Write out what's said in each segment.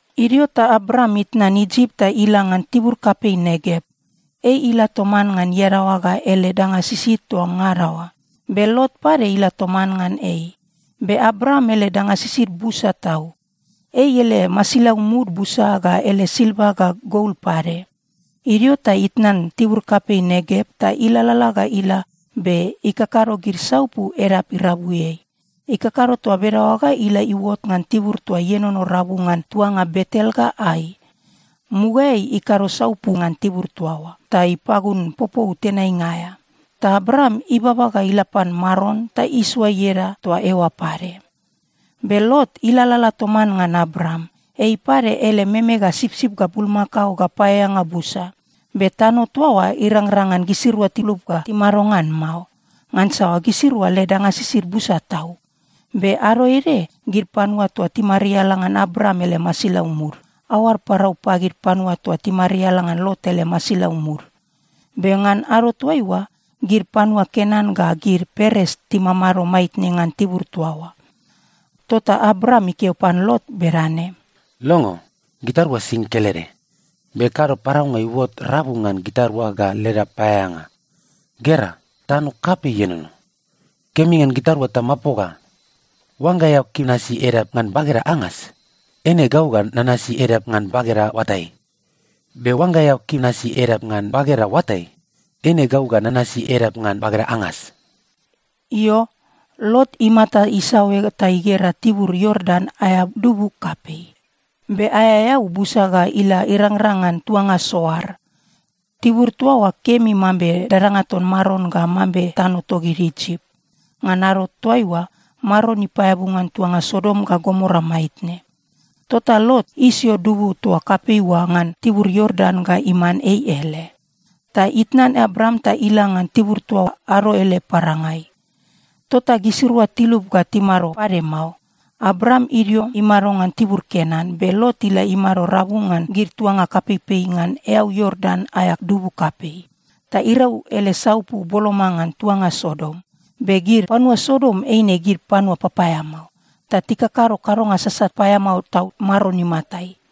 Idio ta Abram itnan Isip ta ila ngan tibur kapei Negev. Ei ila toman ngan iadaoa ga ele danga sisid toa ngada oa. Be Lot pade ila toman ngan ei. Be Abram ele danga sisid busa tau. Ei ele masilau mud busa ga ele silva ga gol pade. Idio ta itnan tibur kapei Negev ta ilalala ga ila be ikakado gid saupu edap irabuiai. Ikakado toa bedaoa ga ila iuot ngan tibur toa ienono rabu ngan tuanga Betel ga Ai. Mugaeai ikado saupu ngan tibur toa oa ta ipagun popou tenainga aea. Ta Abram ibaba ga ila pan Maron ta isoa ieda toa eoa pade. Be Lot ilalala toman ngan Abram, ei pade ele meme ga sipsip ga bulmakao ga paeaeanga busa. Be tano toa oa irangrang ngan gisirua tilup ga timado ngan mao, ngansa gisirua led danga sisid busa tau. Be ado ede gid panua toa timariala ngan Abram ele masilau mud, aoad parau pagid panua toa timariala ngan Lot ele masilau mud. Be ngan ado toaiua, gid panua Kenan ga gid Peres timamado maitne ngan tibur toa oa. Tota Abram ikeo pan Lot bedane, “Longo. Gitarua sing kelede. Be kado paraunga iuot rabu ngan gitarua ga leda paeaeanga. Gera, tano kapei ienono. Kemi ngan gitarua tamapoga. Oangga eao kim nasi edap ngan bageda angas, eine gau ga nanasi edap ngan bageda oatai. Be oangga eao kim nasi edap ngan bageda oatai, eine gau ga nanasi edap ngan bageda angas.” Io, Lot imata isaoe ta igera tibur Iordan aea dubu kapei, be aea eau busa ga ila irangrang ngan tuanga Soar. Tibur toa oa kemi mambe dadanga ton Maron ga mambe tano togid Isip. (Ngan ado toaiua, Maron ipaeabu ngan tuanga Sodom ga Gomora maitne.) Tota Lot isio dubu toa kapei oa ngan tibur Iordan ga iman ei ele. Ta itnan Abram ta ila ngan tibur toa ado ele parangai. Tota gisirua tilup ga timado pade mao. Abram idio imado ngan tibur Kenan, be Lot ila imado rabu ngan gid tuanga kapeipei ngan eau Iordan aea dubu kapei. Ta irau ele saupu boloma ngan tuanga Sodom. Be gid panua Sodom eine gid panua papaeamao, ta tikakado kadonga sasat paeamao tau Maron imatai.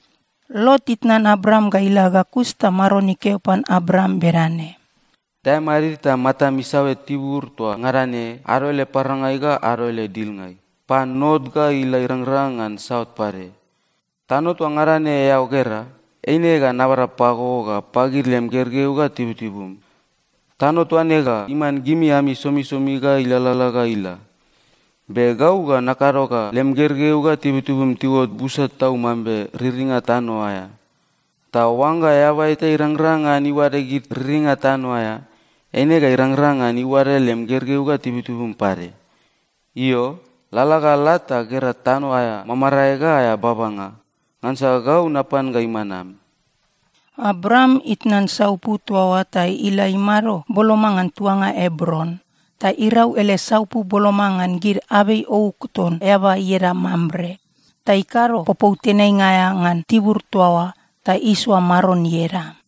Lot itnan Abram ga ila ga kus ta Maron ikeo pan Abram bedane, “Dae madid ta matam isaoe tibur toa ngada ne ado ele parangai ga ado ele dilngai, pan not ga ila irangrang ngan saut pade. Tano toa ngada ne eao gera, eine ga nabada pago ga pagid lem gergeu ga tibutibum. Tano toa ne ga iman gimi ami somisomi ga ilalala ga ila. Be gau ga nakado ga lem gergeu ga tibutibum tiuot busa tau mambe riringa tano aea. Ta oangga eaba eta irangrang ngan iuade gid riringa tano aea, eine ga irangrang ngan iuade lem gergeu ga tibutibum pade. Io, lalala ga la ta gera tano aea mamarae ga aea babanga, ngansa gau napan ga iman am.” Abram itnan saupu toa oa ta ila imado boloma ngan tuanga Ebron, ta irau ele saupu boloma ngan gid abei ouk ton eaba ieda Mamre. Ta ikado popou tenainga aea ngan tibur toa oa ta isoa Maron ieda.